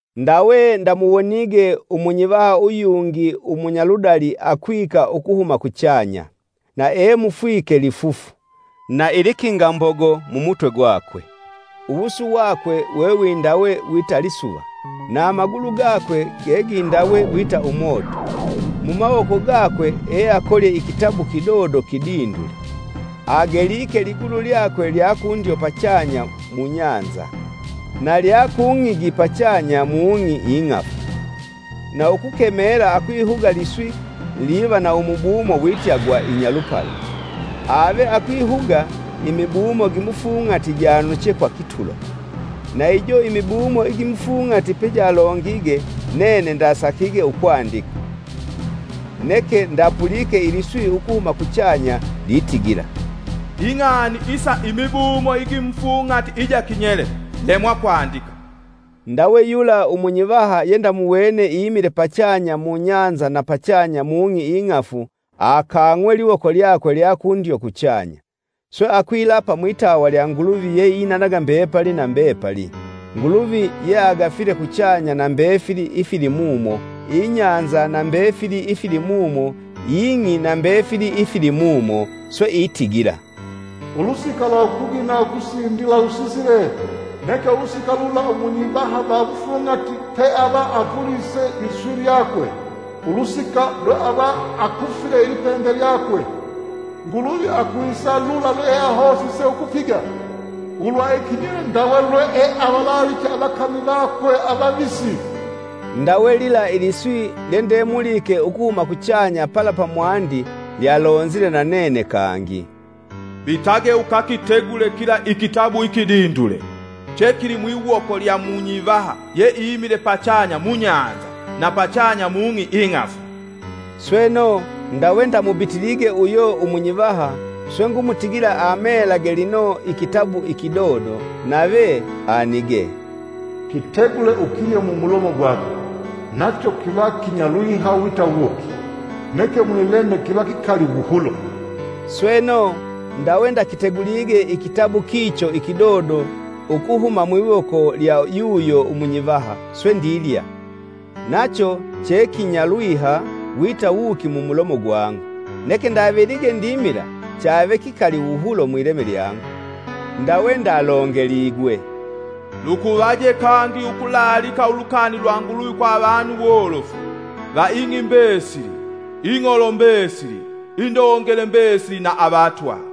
Ndawe ndamuwonige umunyivaha uyungi umunyaludali akwika ukuhuma kuchanya. Na emufwike lifufu, na ilikinga mbogo mumutwe gwakwe. Uwusu wakwe wewindawe wita lisuva, na amagulu gakwe gegindawe wita umoto. Mumawoko gakwe eakolye ikitabu kidodo kidindule. Ageliike ligulu lyakwe lya kundyo pachanya mubahali, na lya kung'igi pachanya mung'i ing'afu, na ukukemela akwihuga liswi liva na umubumo wita gwa Inyalupala. Ave akwihuga, imibumo gimufung'ati januche kwa kitulo. Na ijo imibumo igimufung'ati pejalongige, nene ndasakige ukwandika. Neke ndapulike iliswi ukuhuma kuchanya litigila, “Ing'ani isa imibumo igimufung'ati ijo kinyele, lemwa kwandika!” Ndawe yula umunyivaha yendamuwene imile pachanya mubahali na pachanya mung'i ing'afu akaang'we liwoko lyakwe lya kundyo kuchanya, swe akwilapa mwitawa lya Nguluvi yeinanaga mbepali na mbepali, Nguluvi yeagafile kuchanya na mbefili ifilimumo, ibahali na mbefili ifilimumo ing'i na mbefili ifilimumo. Swe itigila, “Ulusika lwa ukugina ukusindila lusisile! Neke ulusika lula umunyivaha va mufung'ati peavapulise liswi lyakwe, ulusika lwe ava akufile ilipembe lyakwe, Nguluvi akwisa lula lwealahosise ukupiga ulwa ikinyele ndawe lweeavalaliche avakami vakwe avavisi.” Ndawe lila iliswi lyendemulike ukuhuma kuchanya pala pamwandi lyalonzile nanene kangi, “Bitage ukakitegule kila ikitabu ikidindule, chekili mwiwoko lya munyivaha yeimile pachanya mubahali na pachanya mung'i ing'afu.” Sweno, ndawe ndamubitilige uyo umunyivaha, swe ngumutigila amelage lino ikitabu ikidodo. Nave anigee, “Kitegule ukilye mumulomo gwako, nacho kiva kinyalwiha wita wuki, neke mwileme kiva kikali wuhulo!” Sweno, ndawe ndakitegulige ikitabu kicho ikidodo ukuhuma mwiwoko lya yuyo umunyivaha, swe ndilya, nacho chekinyalwiha wita wuki mumulomo gwangu, neke ndavelige ndimila chave kikali wuhulo mwileme lyangu. Ndawe ndalongeligwe, “Lukuvaje kangi ukulaalika ulukani lwa Nguluvi kwa avanu wolofu, va ing'i mbesili, ing'olo mbesili, indongele mbesili na avatwa!”